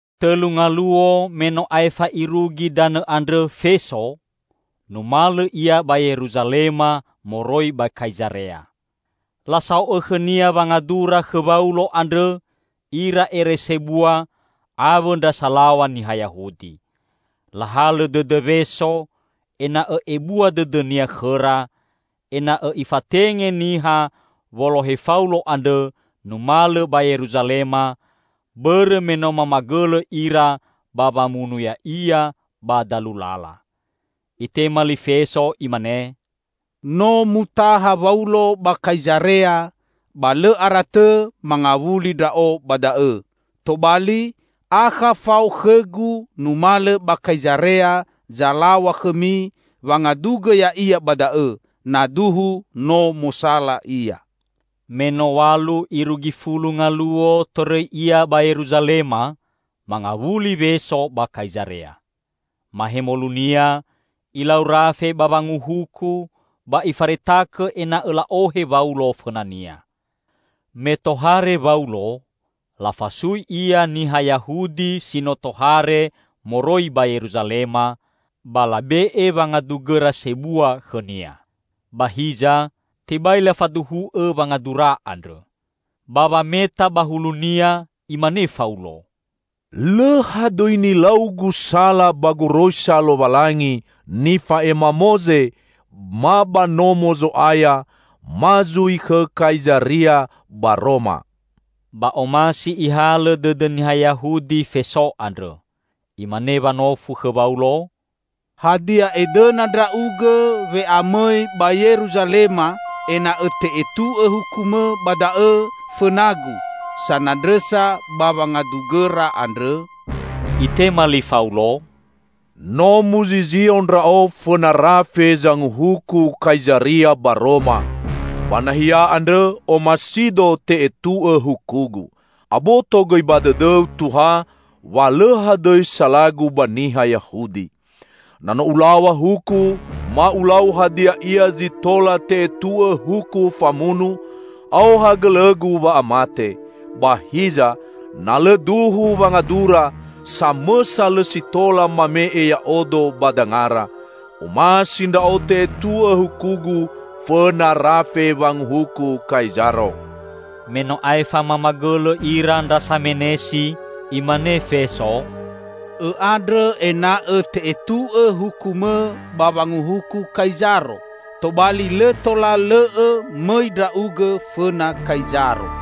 Tõlu ngaluo me no aefa irugi danõ andrõ Feso, numalõ ia ba Yeruzalema moroi ba Kaizarea. Lasao'õ khõnia wangadura khõ Waulo andrõ ira ere sebua awõ ndra salaw̃a niha Yahudi. Lahalõ dõdõ Weso ena'õ ebua dõdõnia khõra, ena'õ ifatenge niha wolohe Faulo andrõ numalõ ba Yeruzalema, bõrõ me no mamagõlõ ira ba wamunu ya'ia ba dalu lala. Itema li Feso imane, "No mutaha Waulo ba Kaizarea; ba lõ ara tõ mangawuli ndra'o ba da'õ. Tobali, akha fao khõgu numalõ ba Kaizarea zalaw̃a khõmi wangadugõ ya'ia ba da'õ, na duhu no mosala ia." Me no w̃alu irugi fulu ngaluo torõi ia ba Yeruzalema, mangawuli Weso ba Kaizarea. Mahemolunia ilau rafe ba wanguhuku ba ifaretakõ ena'õ la'ohe Waulo fõnania. Me tohare Waulo, lafasui ia niha Yahudi si no tohare moroi ba Yeruzalema, ba labe'e wangadugõra sebua khõnia. Ba hiza, tebai lafaduhu'õ wangadura andrõ. Ba wameta ba hulunia, imane Faulo, "Lõ hadõi nilaugu sala ba goroisa Lowalangi nifa'ema Moze ma ba Nomo Zo'aya ma zui khõ Kaizaria ba Roma." Ba omasi ihalõ dõdõ niha Yahudi Feso andrõ. Imane wanofu khõ Waulo, "Hadia edõna ndra'ugõ we'amõi ba Yeruzalema ena'õ te'etu'õ hukumõ ba da'õ fõnagu sanandrõsa ba wangadugõra andrõ?" Itema li Faulo, "No muzizio ndra'o fõna rafe zanguhuku Kaizaria ba Roma; ba nahia andrõ omasido te'etu'õ hukugu. Aboto gõi ba dõdõu, Tuha, wa lõ hadõi salagu ba niha Yahudi. Na no ulaw̃a huku ma ulau hadia ia zi tola te'etu'õ huku famunu, aoha gõlõgu wa'amate. Ba hiza, na lõ duhu wangadura, samõsa lõ si tola mame'e ya'odo ba dangara. Omasi ndra'o te'etu'õ hukugu fõna rafe wanguhuku Kaizaro!" Me no aefa mamagõlõ ira ndra samenesi, imane Feso, "Õ'andrõ ena'õ te'etu'õ hukumõ ba wanguhuku Kaizaro, tobali lõ tola lõ'õ mõi ndra'ugõ fõna Kaizaro."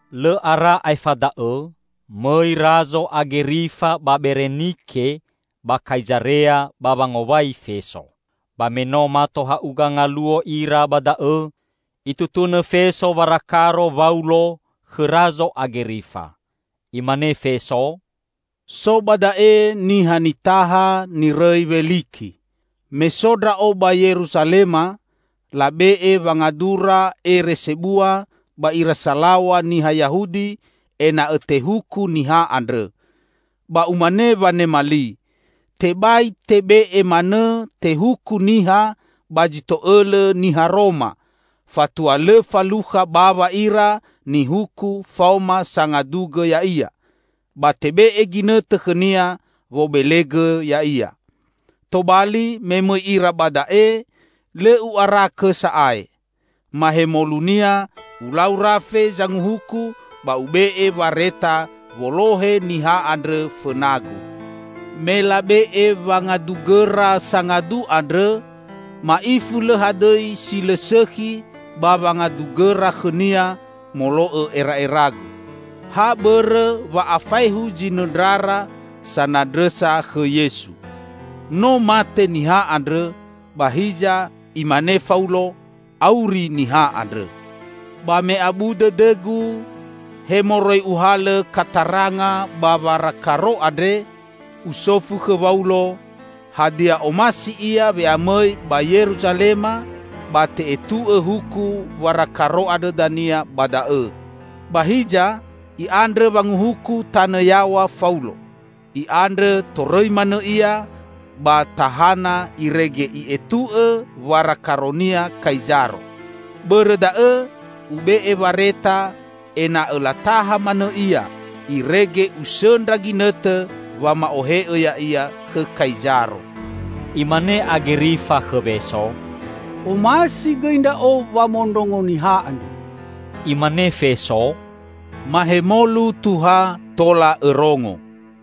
Lõ ara aefa da'õ, mõi Razo Agerifa ba Berenike ba Kaizarea ba wangowai Feso. Ba me no mato ha'uga ngaluo ira ba da'õ, itutunõ Feso warakaro Waulo khõ Razo Agerifa. Imane Feso, "So ba da'e niha nitaha nirõi Weliki. Me so ndra'o ba Yeruzalema, labe'e wangadura ere sebua ba ira salaw̃a niha Yahudi ena'õ tehuku niha andrõ. Ba umane wanema li, tebai tebe'e manõ tehuku niha ba zi to'õlõ niha Roma, fatua lõ falukha bawa ira nihuku faoma sangadugõ ya'ia, ba tebe'e ginõtõ khõnia wobelegõ ya'ia. Tobali me mõi ira ba da'e, lõ u'arakõ sa'ae. Mahemolunia ulau rafe zanguhuku ba ube'e wareta wolohe niha andrõ fõnagu. Me labe'e wangadugõra sangadu andrõ, ma'ifu lõ hadõi si lõ sõkhi ba wangadugõra khõnia molo'õ era'eragu. Ha bõrõ wa'afaehu zinõndrara sanandrõsa khõ Yesu. No mate niha andrõ, ba hiza imane Faulo, auri niha andrõ. Ba me abu dõdõgu he moroi uhalõ kataranga ba warakaro andre, usofu khõ Waulo hadia omasi ia we'amõi ba Yeruzalema ba te'etu'õ huku warakaro andrõ dania ba da'õ. Ba hiza i'andrõ wanguhuku tanõ yaw̃a Faulo; i'andrõ torõi manõ ia ba tahana irege i'etu'õ warakaronia Kaizaro. Bõrõ da'õ ube'e wareta ena'õ lataha manõ ia, irege usõndra ginõtõ wama'ohe'õ ya'ia khõ Kaizaro." Imane Agerifa khõ Weso, "Omasi gõi ndra'o wamondrongo niha andrõ." Imane Feso, "Mahemolu, Tuha, tola õrongo."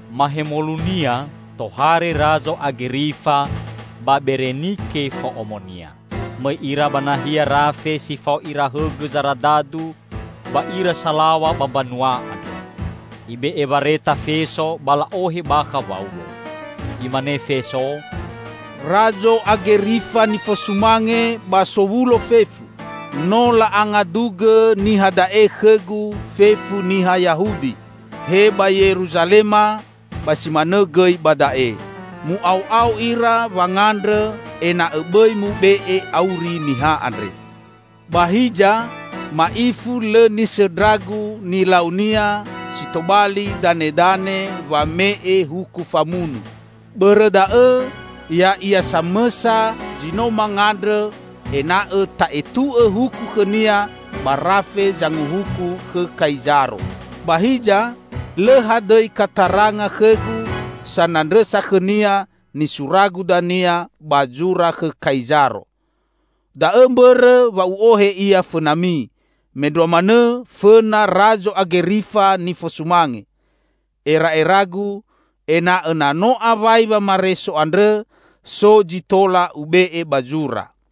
Mahemolunia tohare Razo Agerifa ba Berenike fo'omonia. Mõi ira ba nahia rafe si fao ira hõgõ zaradadu ba ira salaw̃a ba mbanua andrõ. Ibe'e wareta Feso ba la'ohe bakha Waulo. Imane Feso, "Razo Agerifa nifosumange ba sowulo fefu! No la'angadugõ niha da'e khõgu fefu niha Yahudi, he ba Yeruzalema ba si manõ gõi ba da'e. Mu'ao'ao ira wangandrõ ena'õ bõi mube'e auri niha andre. Ba hiza ma'ifu lõ nisõndragu nilaunia si tobali danedane wame'e huku famunu. Bõrõ da'õ, ya'ia samõsa zi no mangandrõ ena'õ ta'etu'õ huku khõnia ba rafe zanguhuku khõ Kaizaro. Ba hiza lõ hadõi kataranga khõgu sanandrõsa khõnia nisuragu dania ba zura khõ Kaizaro. Da'õ mbõrõ wa u'ohe ia fõnami, mendrua manõ fõna Razo Agerifa nifosumange! Era'eragu, ena'õ na no awai wamareso andrõ, so zi tola ube'e ba zura.